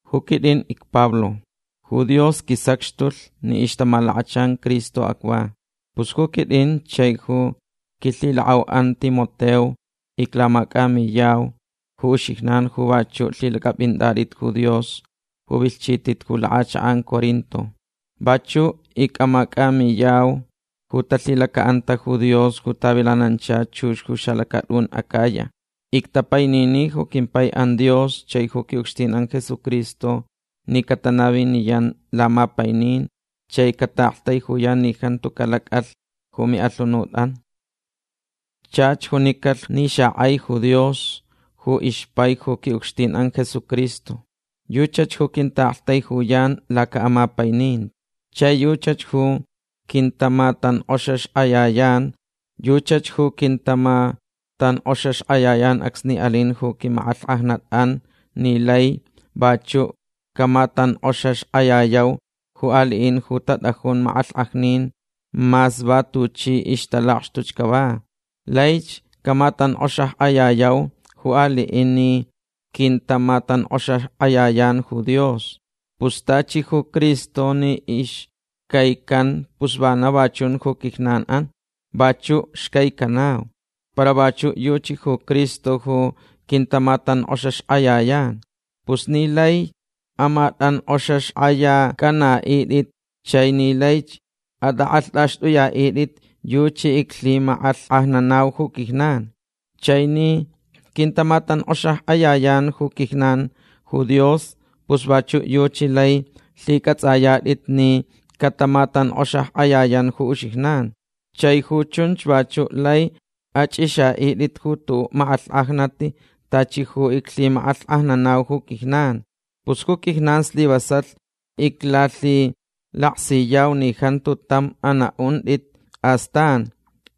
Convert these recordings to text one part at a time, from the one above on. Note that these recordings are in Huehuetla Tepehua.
Ju quit'in icPablo. Ju Dios quisacxtulh ni ixtamalakachan Cristo acva. Pus ju quit'in chai ju quilhilak'au'an Timoteo iclamac'amiyau ju uxijnan ju vachu' lhilac'ap'int'at'it ju Dios ju vilhchit'it ju lak'achak'an Corinto. Vachu' ic'amac'amiyau ju talhilaca'anta ju Dios ju tavilanancha chux ju xalacat'un Acaya. Ictapainini ju quimpai'an Dios chai ju qui'ucxtin'an Jesucristo ni catanaviniyan lamapainin chai cata'aktaijuyan ni jantu calac'alh ju mi'alhunut'an. Chach junicalh ni xak'aich ju Dios ju ixpai ju qui'ucxtin'an Jesucristo. Yuchach ju quinta'aktaijuyan laca'amapaininti. Chai yuchach ju quintamatank'oxaxk'ayayan. Yuchach ju quintamatank'oxaxk'ayayan acsni alin ju quimak'alhk'ajnat'an ni laich vachu' camatank'oxaxk'ayayau ju ali'in ju tat'ajun mak'alhk'ajnin mas va tuchi ixtalakxtuch cava. Laich camatank'oxaxk'ayayau ju ali'in ni quintamatank'oxaxk'ayayan ju Dios. Pus tachi ju Cristo ni ixcaican pus va na va chun ju quijnan'an. Vachu' xcaicanau. Para vachu' yuchi ju Cristo ju quintamatank'oxaxk'ayayan. Pus ni laich amat'ank'oxaxk'ayac'ana'it'it chai ni laich at'ak'alht'axt'uya'it'it yuchi iclhimak'alhk'ajnanau ju quijnan. Chai ni quintamatank'oxaxk'ayayan ju quijnan ju Dios pus vachu' yuchi lai lhic'ats'aya'it'it ni catamatank'oxaxk'ayayan ju uxijnan. Chai ju chunch vachu' lai ach'ix'a'it'it ju tu'u' mak'alhk'ajnat tachi ju iclhimak'alhk'ajnanau ju quijnan. Pus ju quijnan slivasalh iclalhilaksiyau ni jantu tam ana'unt'it astan.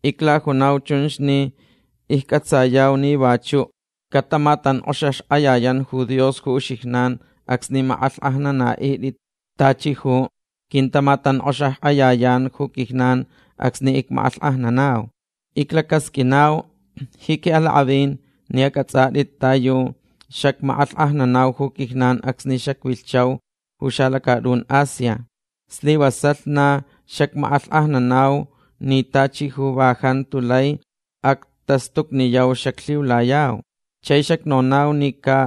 Iclajunau chunch ni icc'atsayau ni vachu' catamatank'oxaxk'ayayan ju Dios ju uxijnan acsni mak'alhk'ajnanat'it tachi ju quintamatank'oxaxk'ayayan ju quijnan acsni icmak'alhk'ajnanau. Iclacasq'uinau ji qui'alak'avin ni ac'ats'at'it ta yu xacmak'alhk'ajnanau ju quijnan acsni xacvilhchau ju xalacat'un Asia. Slivasalh na xacmak'alhk'ajnanau ni tachi ju va jantu lai actastucniyau xaclhiulayau. Chai xacnonau ni ca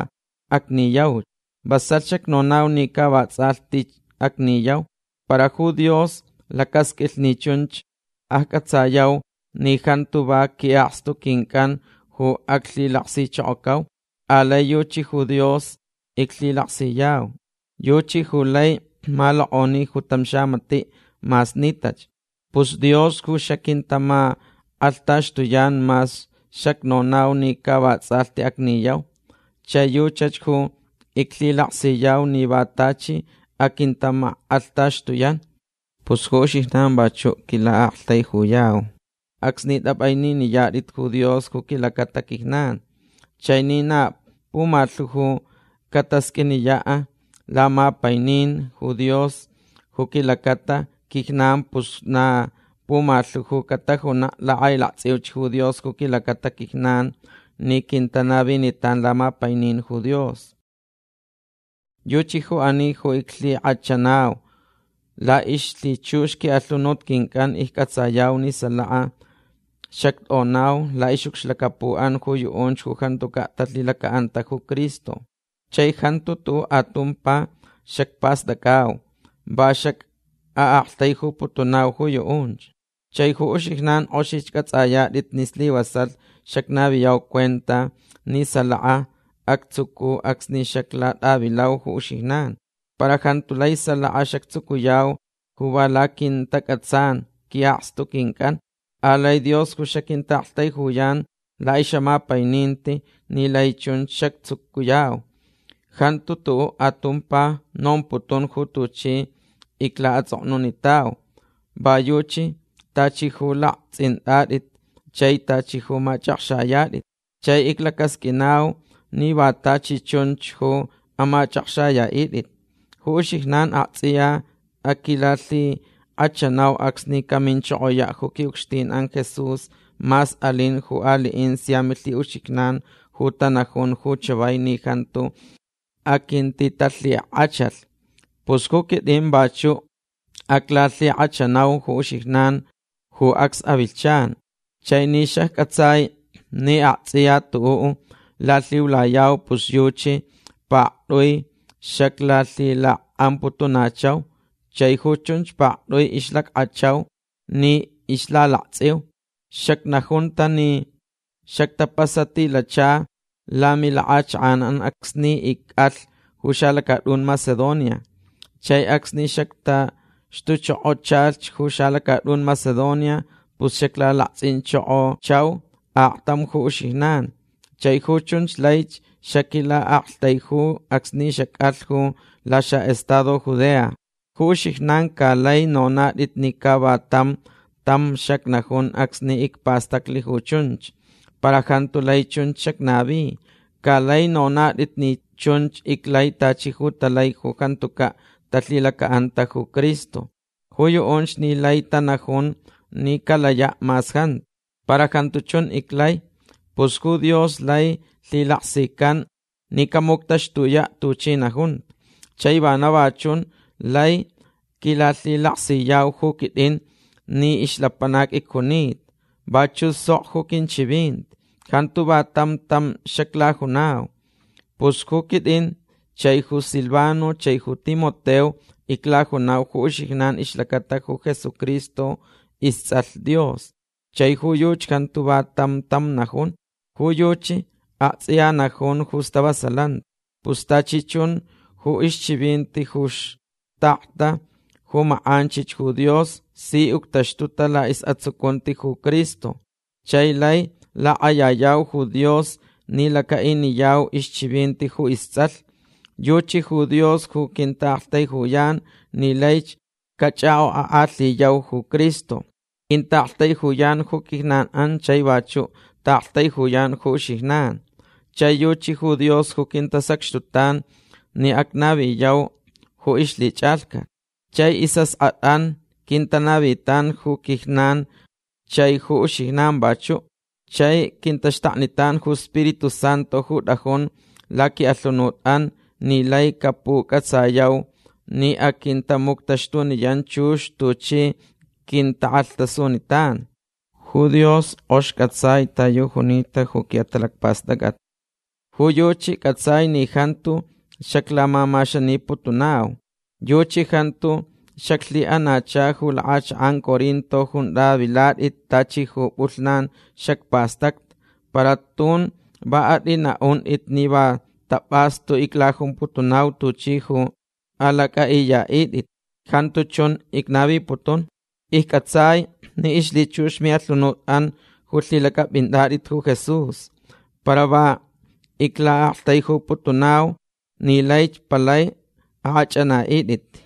acniyauch. Vasalh xacnonau ni ca vats'alhti acniyau. Para ju Dios lacasq'uilh ni chunch acc'atsayau ni jantu va qui'akstu quinc'an ju aclhilaksichokocau. Alai yuchi ju Dios aclhilaksiu. Yuchach ju lai malok'oni ju tam xamati' mas nitach. Pus Dios ju xaquintamak'alhtaxtuyan mas xacnonau ni ca vats'alhti acniyau. Chai yuchach ju iclhilaksiyau ni va tachi aquintamak'alhtaxtuyan. Pus ju uxijnan vachu' quila'aktaijuyauch acsni t'ap'aininiyat'it ju Dios ju quilacata quijnan. Chai ni na pumalhu ju catasq'uiniya' lamapainin ju Dios ju quilacata quijnan pus na pumalhu ju catajuna' lak'ailakts'iuch ju Dios ju quilacata quijnan ni quintanavinitan lamapainin ju Dios. Yuchi ju ani ju iclhik'achanau. La'ixlhichux qui'alhunut quinc'an icc'atsayau ni salaka xact'onau la'ix'ucxlacapu'an ju yu'unch ju jantuca' talhilaca'anta ju Cristo. Chai jantu tu'u' atumpa xacpast'ac'au. Va xac'a'aktaijuputunau ju yu'unch. Chai ju uxijnan k'oxich c'ats'ayat'it ni slivasalh xacnaviyau cuenta ni salaka actsucu acsni xaclat'avilau ju uxijnan. Para jantu lai salaka xactsucuyau ju va laquintac'atsan qui'akstu quinc'an. Alai Dios ju xaquinta'aktaijuyan la'ix'amapaininti ni lai chun xactsucuyau. Jantu tu'u' atumpa nomputun ju tuchi icla'ats'oknunitau. Va yuchi tachi ju lakts'int'at'it chai tachi ju mach'akxayat'it. Chai iclacasq'uinauch ni va tachi chunch ju amach'akxaya'it'it. Ju uxijnan akts'iya aquilalhik'achanau acsni caminchokoya' ju qui'ucxtin'an Jesús mas alin ju ali'in sia milhi'uxijnan ju tanajun ju chavai ni jantu aquintitalhik'achalh. Pus ju quit'in vachu' aclalhik'achanauch ju uxijnan ju acs avilhchan. Chai ni xacc'atsai ni akts'iya tu'u' lalhiulayau pus yuchi pakt'ui xaclalhilak'amputunachau. Chai ju chunch pakt'ui ixlack'achau ni ixlalakts'iu. Xacnajunta ni xactapasatilachalh lamilak'achak'an acsni ic'alh ju xalacat'un Macedonia. Chai acsni xactaxtuchokochalh ju xalacat'un Macedonia pus xaclalakts'inchokochauch aktam ju uxijnan. Chai ju chunch laich xaquila'aktaiju acsni xac'alh ju laxa'estado Judea. Ju uxijnan ca laich nonat'it ni ca va tam tam xacnajun acsni icpastaclh ju chunch. Para jantu lai chunch xacnavi. Ca laich nonat'it ni chunch iclai tachi ju talai ju jantuca' talhilaca'anta ju Cristo. Ju yu'unch ni laich tanajun ni calaya' mas jantu. Para jantu chun iclai. Pus ju Dios lai lhilaksican ni camuctaxtuya' tuchi najunta. Chai vana va chun lai quilalhilaksiyau ju quit'in ni ixlapanac icjunita. Vachu' sok ju quinchivinti. Jantu va tam tam xaclajunau. Pus ju quit'in chai ju Silvano chai ju Timoteo iclajuntau ju uxijnan ixlacata ju Jesucristo ists'alh Dios. Chai ju yuchi jantu va tam tam najun. Ju yuchi akts'iya najun ju stavasalanti. Pus tachi chun ju ixchivinti ju xtakta ju mak'anchich ju Dios si uctaxtuta la'is'atsucunti ju Cristo. Chai lai lak'ayayau ju Dios ni laca'iniyau ixchivinti ju ists'alh. Yuchi ju Dios ju quinta'aktaijuyan ni laich cach'ak'ok'ak'alhiyau ju Cristo. Quinta'aktaijuyan ju quijnan chai vachu' ta'aktaijuyan ju uxijnan. Chai yuchi ju Dios ju quintasacxtutan ni acnaviniyau ju ixlhich'alhcat. Chai is'ask'at'an quintanavitan ju quijnan chai ju uxijnan vachu'. Chai quintaxtaknitan ju Spiritu Santu ju t'ajun laqui'alhunut'an ni laich capuc'atsayauch ni aquintamuctaxtuniyan chux tuchi quintak'alhtasunitan. Ju Dios k'ox c'atsai ta yu junita ju qui'atalacpast'ac'at. Ju yuchi c'atsai ni jantu xaclamamaxaniputunau. Yuchi jantu xaclhi'anacha ju lak'achak'an Corinto junta vilat'it tachi ju p'ulhnan xacpastacta. Para tun va at'ina'unt'it ni va tap'astu iclajumputunau tuchi lai alac'a'iya'it'it. Jantu chun icnaviputun. Icc'atsaich ni ixlhichux mi'alhunut'an ju lhilac'ap'inat'it ju Jesús. Para va icla'aktaijuputunau ni laich palai ak'ach'ana'it'it.